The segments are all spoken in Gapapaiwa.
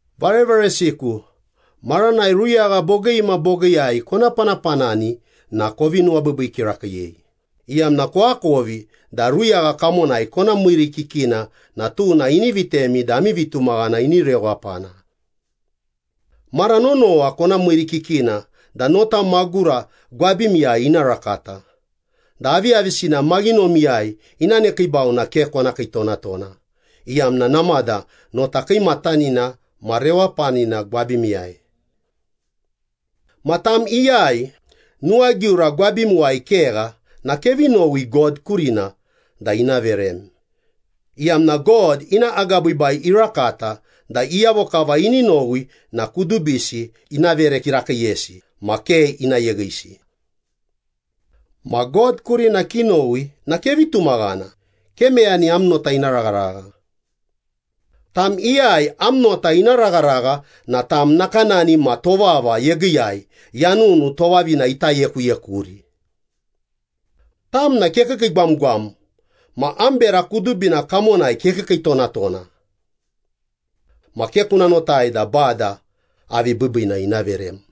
Varevaresiku, maranai ruyagha bogii ma bogiiyai kona panapanani na kovi nuwabiibii kirakiiyei, iyamna koakovi da ruyagha kamonai kona miirikikina na tuna ini vitemi da ami vitumaghana ini rewapana. Mara nonowa kona miirikikina da nota magura gwabimiyai ina rakata, da aviyavisina maghinomiyai ina nekiibau na ke kona kiitonatona, iyamna namada nota kiimatanina ma rewapanina gwabimiyai. Ma tam iyai nuwagiura gwabimuwai kegha na kevi nowi God kurina da ina verem, iyamna God ina agabiibai irakata da iyavo kava ini nowi na kudubisi ina vere kirakiiyesi ma ke ina yeghisi. Ma God kurina kinowi na kevi tumaghana, ke meyani am nota ina ragharagha. Tam iyai am nota ina ragharagha na tam nakanani ma tovava yegiiyai, yanunu tovavina ita yekuyekuri. Tam na kekiikiigwamgwam ma am bera kudubina kamonai kekiikiitonatona. Ma ke kuna notai da Bada avi biibiina ina verem.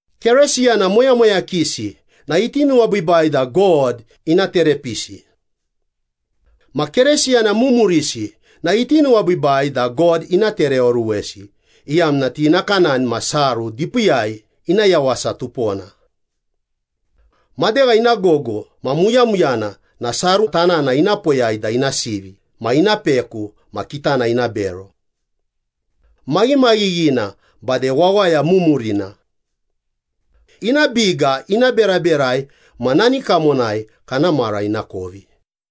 Keresiyana moyamoyakisi na iti nuwabiibai da God ina terepisi. Ma Keresiyana mumurisi iti nuwabiibai da God ina tereoruwesi, iyamna ti nakanani ma saru dipiiyai, ina yawasa tupona. Madegha ina gogo ma muyamuyana na saru tanana ina poyai da ina sivi ma ina peku ma kitana ina bero. Maghimaghighina bade wawaya mumurina. Ina biga ina beraberai ma nani kamonai kana mara ina kovi.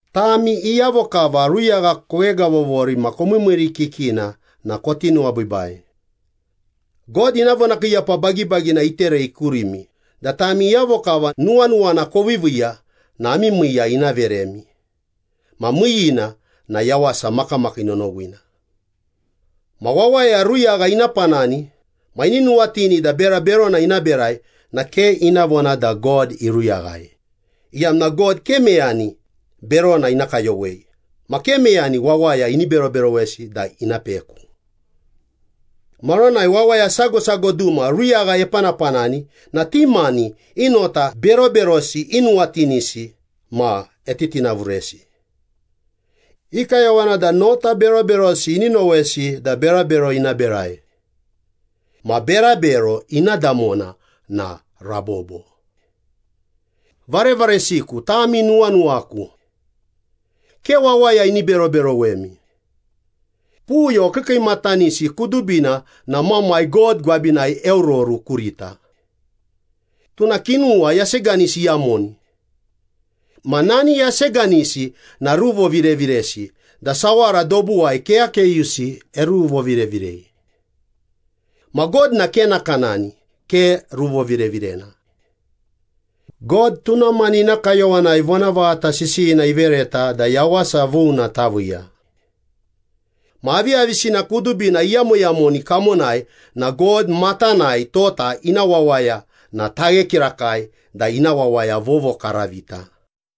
Tami iyavo kava ruyagha koghegavovori ma komiimiirikikina na koti nuwabiibai. God ina vonakiiyapa bagibagina iterei kurimi da tami iyavo kava nuwanuwana koviiviiya na ami miiya ina veremi ma miiyiina na yawasa makamakii nonowina. Ma wawaya ruyagha ina panani ma ini nuwatini da bera berona ina berai na ke ina vona da God iruyaghai, iyamna God ke meyani berona ina kayowei ma ke meyani wawaya ini beroberowesi da ina peku. Maranai wawaya sago sago duma ruyagha epanapanani na ti mani i nota beroberosi inuwatinisi ma etitinavuresi. I kayowana da nota beroberosi ini nowesi da berabero ina berai. Ma berabero ina damona na rabobo. Varevaresiku, tami nuwanuwaku. Ke wawaya ini beroberowemi. Puyo kiikiimatanisi kudubina na Mamai God gwabinai eororu kurita. Tuna kinuwa yaseganisi iyamoni. Ma nani yaseganisi na ruvovireviresi da sawara dobuwai keyakeyusi eruruvovirevirei. Ma God na ke nakanani, ke ruvovirevirena. God tuna mani ina kayowanai vonavaghata sisiyina ivereta da yawasa vuna taviiya. Ma aviyavisina kudubina iyamoyamoni kamonai na God matanai tota ina wawaya na taghe kirakai da ina wawaya vovokaravita.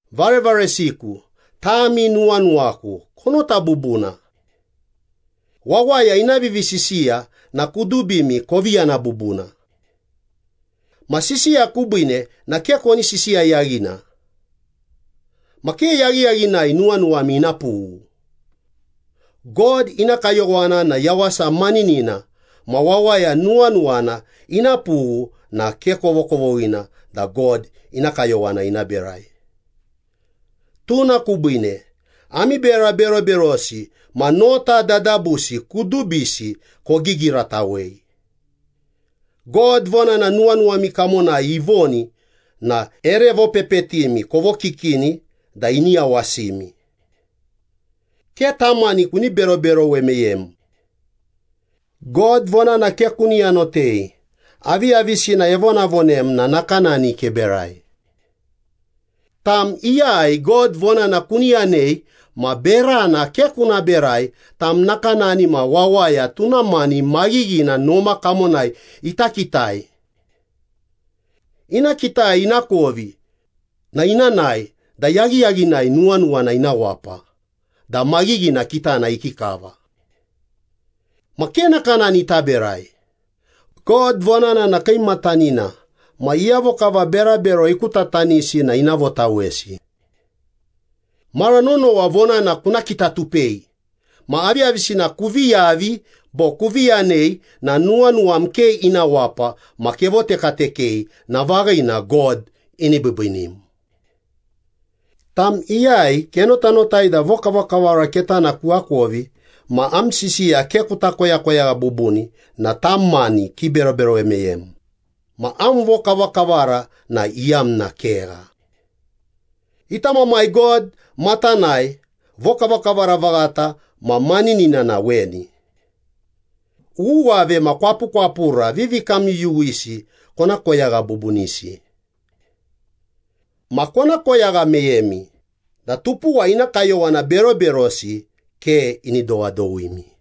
Varevaresiku, tami nuwanuwaku, konota bubuna. Wawaya ina vivisisiya na kudubimi kovi yana bubuna. Ma sisiya kubiine na ke koni sisiya yaghina. Ma ke yaghiyaghinai nuwanuwami ina pughu. God ina kayowana na yawasa maninina ma wawaya nuwanuwana ina pughu na ke kovokovoghina da God ina kayowana ina berai. Tuna kubiine ami bera beroberosi ma nota dadabusi kudubisi kogigiratawei. God vonana nuwanuwami kamonai ivoni na ere vopepetimi kovokikini da ini yawasimi. Ke tam mani kuni beroberowe meyem. God vonana ke kuni yanotei, aviyavisina evonavonem na nakanani keberai. Tam iyai God vonana kuni yanei ma berana ke kuna berai, tam nakanani ma wawaya tuna mani maghighina noma kamonai ita kitai. Ina kitai ina kovi na ina nae da yaghiyaghinai nuwanuwana ina wapa da maghighina kitana ikikava. Ma ke nakanani taberai. God vonana na kiimatanina ma iyavo kava berabero ikutatanisi na ina votawesi. Mara nonowa vonana kuna kitatupei, ma aviyavisina kuvi yavi bo kuvi yanei na nuwanuwam ke ina wapa ma kevotekatekei na vaghina God ini biibiinim. Tam iyai kenotanotai da vokavakavara ketana kuakovi ma am sisiya ke kuta koyakoyagha bubuni na tam mani kiberoberowe meyem, ma am vokavakavara na iyamna kegha. Ita Mamai God matanai vokavakavara vaghata ma maninina na weni. Uwuwave ma kwapukwapura vivikamyuyuwisi kona koyagha bubunisi. Ma kona koyagha meyemi da tupuwa ina kayowana beroberosi ke ini dowadowimi.